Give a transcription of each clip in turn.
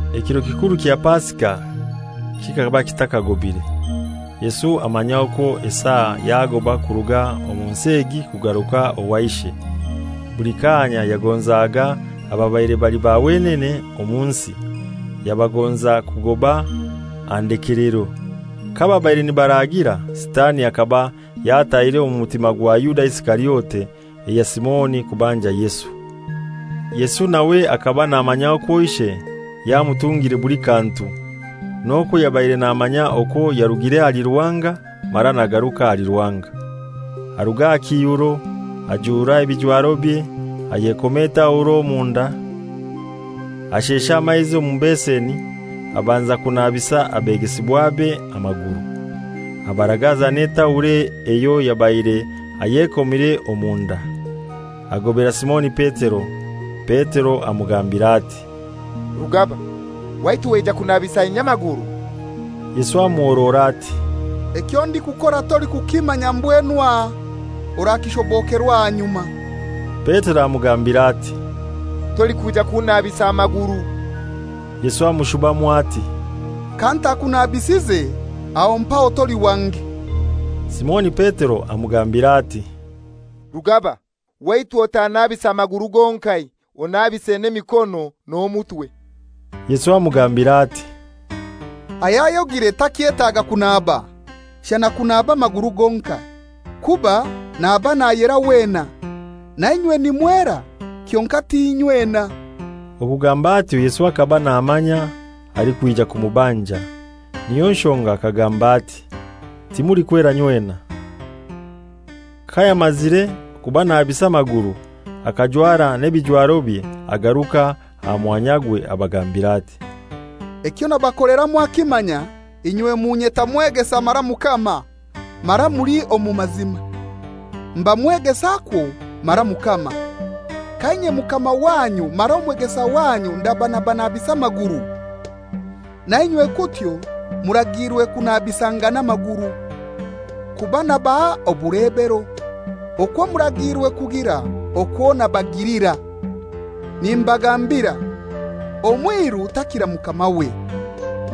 Ekiro kikuru kya Pasika kikaba kitakagobire, Yesu amanya okwo esaa yagoba kuruga omu nsi egi kugaruka owa Ishe. Buli kaanya yagonzaga ababaire bali ba wenene omu nsi, yabagonza kugoba aha ndekelero. Kababaire nibaraagira, Sitani akaba yatahire omu mutima gwa Yuda Isikariote eya Simoni kubanja Yesu. Yesu nawe hakaba namanya okwo Ishe yamutungire buli kantu; n'okwo yabaire namanya okwo yarugire ahali Ruhanga mara nagaruka ahali Ruhanga, aruga aha kiihuro, ajura ebijwarobye, ayekoma etauro omunda. Ashesha amaizi omu beseni, abanza kunabisa abegesibwabe amaguru. Abaragaza n'etauro eyo yabaire ayekomire omu nda. Agobera Simoni Petero. Petero amugambira ati, «Rugaba, waitu waija kunabisa inye amaguru?» Yesu amuhorora ati, «Ekyo ndikukora tolikukimanya mbwenu aha, orakishobokerwa ahanyuma.» Petero amugambira ati, «Tolikwija kunnabisa maguru.» Yesu amushubamu ati, «Kantakunabisize, aho mpaho toli wange.» Simoni Petero amugambira ati, «Rugaba, waitu otannabisa maguru gonkai, onnabise n'emikono n'omutwe!» Yesu amugambira ati, «Ayayogire takyetaaga kunaba, shana kunaba amaguru gonkai, kuba naba nayera wena. Nainywe nimwera, kyonkai ti inywena.» Okugamba atyo Yesu hakaba namanya alikwija kumubanja; niyo nshonga akagamba ati, «Timulikwera inywena.» Kayamazire kubanabisa amaguru akajwara n'ebijwarobye, agaruka aha mwanyagwe, abagambira ati, «Ekyo nabakolera mwakimanya? Inywe munyeta Mwegesa mara Mukama; mara muli omu mazima, mba Mwegesa kwo mara Mukama. Ka inye Omukama wanyu mara Omwegesa wanyu ndaba nabanabisa amaguru, nainywe kutyo muragiirwe kunabisangana amaguru. Kuba nabaha obulebero, okwo muragiirwe kugira okwo nabagilira. Nimbagambira, omwiru takira mukamawe,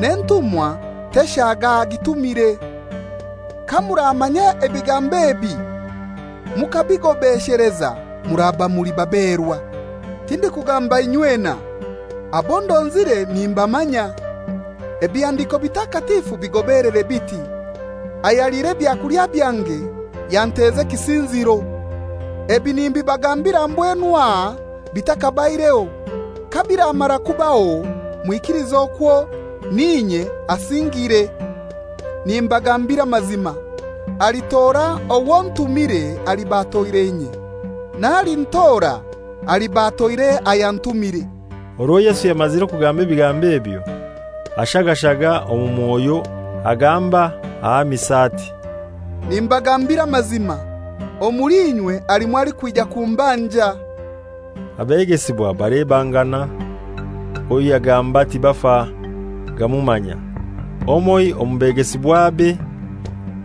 n'entumwa teshaga agitumire. Kamuramanya ebigambo ebi mukabigobesheleza muraba muli baberwa. Tindikugamba inywena. Abo ndonzire nimbamanya; Ebihandiko Bitakatifu bigobelere biti, ‹Ayaliire ebyakulya byange, yanteza ekisinziro.› Ebi nimbibagambira mbwenu aha bithakabaireho, kabiramara kubaho mwikilize okwo ‹N'inye asingiire.› Nimbagambira amazima, alitora owo ntumiire aliba atoire inye. N'alintora aliba atoire ayantumire.» Orwo Yesu yamazire kugamba ebigambo ebyo, ashagashaga omu mwoyo, agamba ahamisa ati, «Nimbagambira amazima, omuli inywe halimu alikwija kumbanja.» Abegesibwa balebangana, owo yagamba tibafa gamumanya. Omoiho omu begesibwabe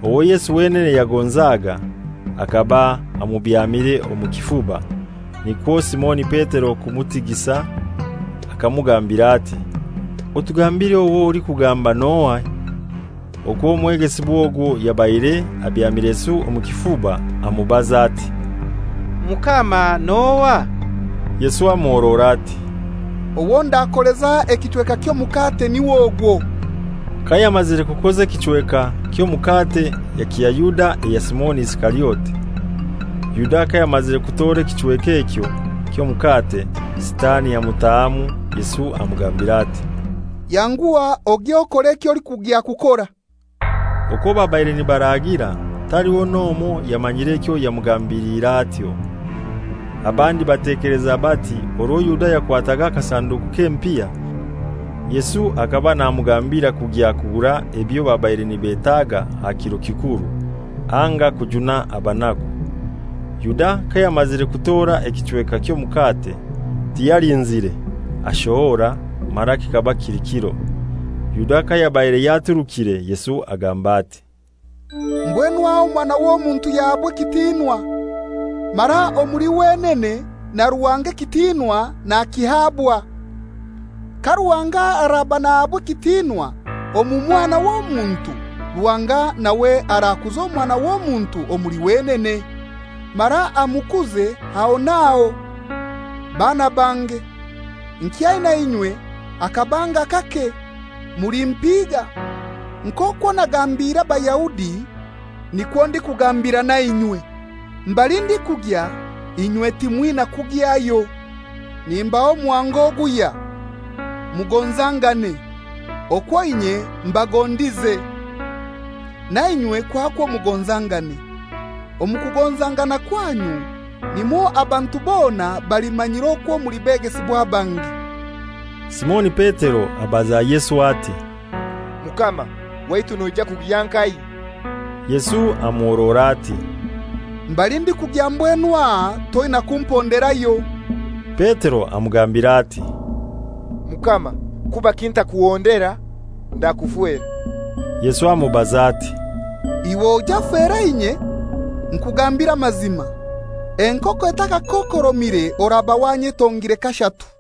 owo Yesu wenene yagonzaga, hakaba amubyamire omu kifuba; nikwo Simoni Petero kumutigisa akamugambira ati, «Otugambire owo alikugamba n'ohai.» Okwo omwegesibwa ogwo yabaire abyamire Yesu omu kifuba, amubaza ati, «Mukama, n'ohai?» Yesu amuhorora ati, «Owo ndakoleza ekichweka ky'omukate niw'ogwo.» Kayamazire kukoza ekichweka ky'omukate yakiha Yuda eya Simoni Isikariote. Yuda kayamazire kutora ekichweka ekyo ky'omukate, Sitani amutahamu. Yesu amugambira ati, «Yanguha ogye okore eky'olikugya kukora.» Okwo babaire nibaraagira taliho n'omoi yamanyire ekyo yamugambiliire atyo. Abandi batekeleza bati orwo Yuda yakwataga akasanduku k'empiha, Yesu hakaba namugambira kugya kugura ebyo babaire nibetaga aha kiro kikuru; anga kujuna abanaku. Yuda kayamazire kutora ekichweka ky'omukate, tiyalinzire, ashohora; mara kikaba kili kiro. Yuda kayabaire yaturukire, Yesu agamba ati, «Mbwenu aha Omwana w'Omuntu yahabwa ekitinwa, mara omuli wenene na Ruhanga ekitinwa nakihabwa. Ka Ruhanga araba nahabwa ekitinwa omu Mwana w'Omuntu, Ruhanga nawe arakuza Omwana w'Omuntu omuli wenene, mara amukuze aho n'aho. Baana bange, nkyaina inywe hakabanga kake. Mulimpiga; nk'okwo nagambire Abayahudi nikwo ndikugambira nainywe: Mbali ndikugya inywe timwina kugyayo. Nimbaha omuhango oguhya: Mugonzangane; okwo inye mbagondize, nainywe kwakwo mugonzangane. Omu kugonzangana kwanyu, nimwo abantu bona balimanyira okwo muli begesibwa bange.» Simoni Petero abaza Yesu ati, «Mukama, waitu noija kugya nkahai?» Yesu amuhorora ati, «Mbali ndikugya mbwenu aha toina kumponderayo.» Petero amugambira ati, «Mukama, kubaki ntakuhondera? Ndakufera.» Yesu amubaza ati, «Iwe oije ofere inye? Nkugambire amazima, enkoko etakakokoromire oraba wanyetongire kashatu.»